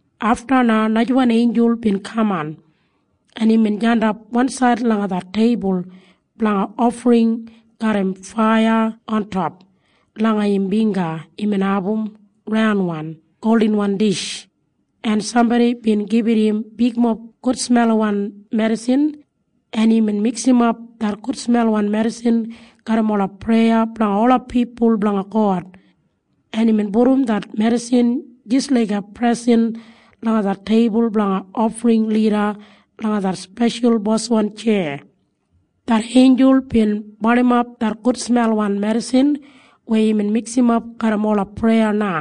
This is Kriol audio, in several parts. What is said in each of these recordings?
Afta na najawan einjul bin kaman, en imbin jandap wansaid langa det teibul blanga ofring garram faiya ontop. Langa im bingga imbin abum raunwan goldinwan dish, en sambodi bin gibit im bigmob gudsmelwan medisin, en imbin miksimap det gudsmelwan medisin garram ola preya blanga ola pipul blanga God, en imbin pudum det medisin jis laiga presen langa det teibul blanga ofring lida langa det speshal boswan tjeya. Det einjul bin barnimap det gudsmelwan medisin weya imbin miksimap garram ola preya na,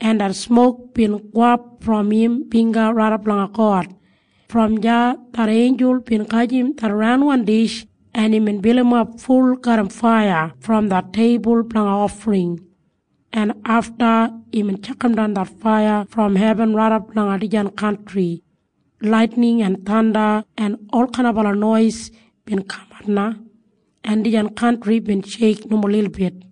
en det smok bin gowap brom im bingga raidap langa God. Brom deya det einjul bin gajim det raunwan dish, en imbin bilimap ful garram faiya brom det teibul blanga ofring, en afta imbin tjakamdan det faiya brom hebin raidap langa dijan kantri. Laitining en thanda en olkainaba nois bin kamat na, en dijan kantri bin sheik nomo lilbit.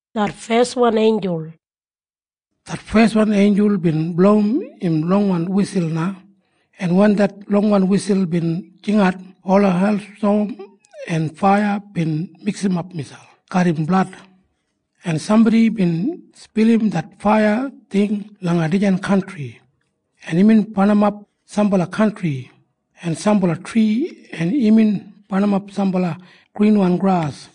Det feswan einjul bin blowim im longwan wisul na, en wen det longwan wisul bin jingat, ola heilstom en faiya bin miksimap miselp garram blad, en sambodi bin spilim det faiya ting langa dijan kantri, en imbin barnimap sambala kantri en sambala tri, en imbin barnimap sambala grinwan gras.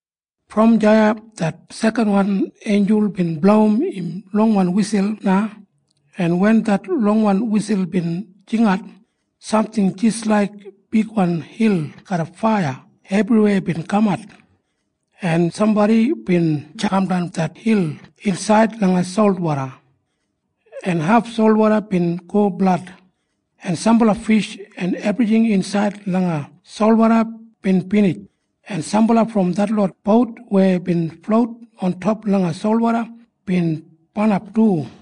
Brom deya det sekanwan einjul bin blowim im longwan wisul na, en wen det longwan wisul bin jingat, samting jis laiga bigwan hil garram faiya ebriwei bin kamat, en sambodi bin tjakamdan det hil insaid langa solwoda, en haf solwoda bin go blad, en sambala fish en ebrijing insaid langa solwoda bin binij, en sambala brom detlot bout weya bin flout ontop langa solwoda bin barnap du.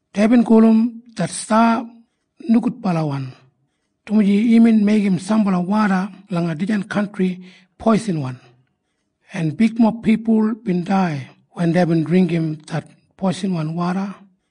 Deibin gulum det sta Nogudbalawan, dumaji imbin meigim sambala woda langa dijan kantri poisinwan, en bigmob pipul bin dai wen deibin dringgim det poisinwan woda.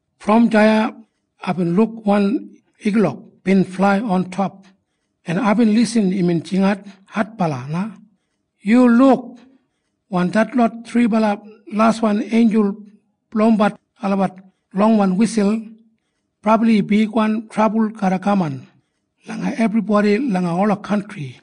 Brom deya aibin luk wan igulok bin flai ontop, en aibin lisin imbin jingat adbala na, “Yu luk! Wen detlot thribala laswan einjul blowimbat olabat longwan wisul, brabli bigwan trabul garra kaman langa ebribodi langa ola kantri!”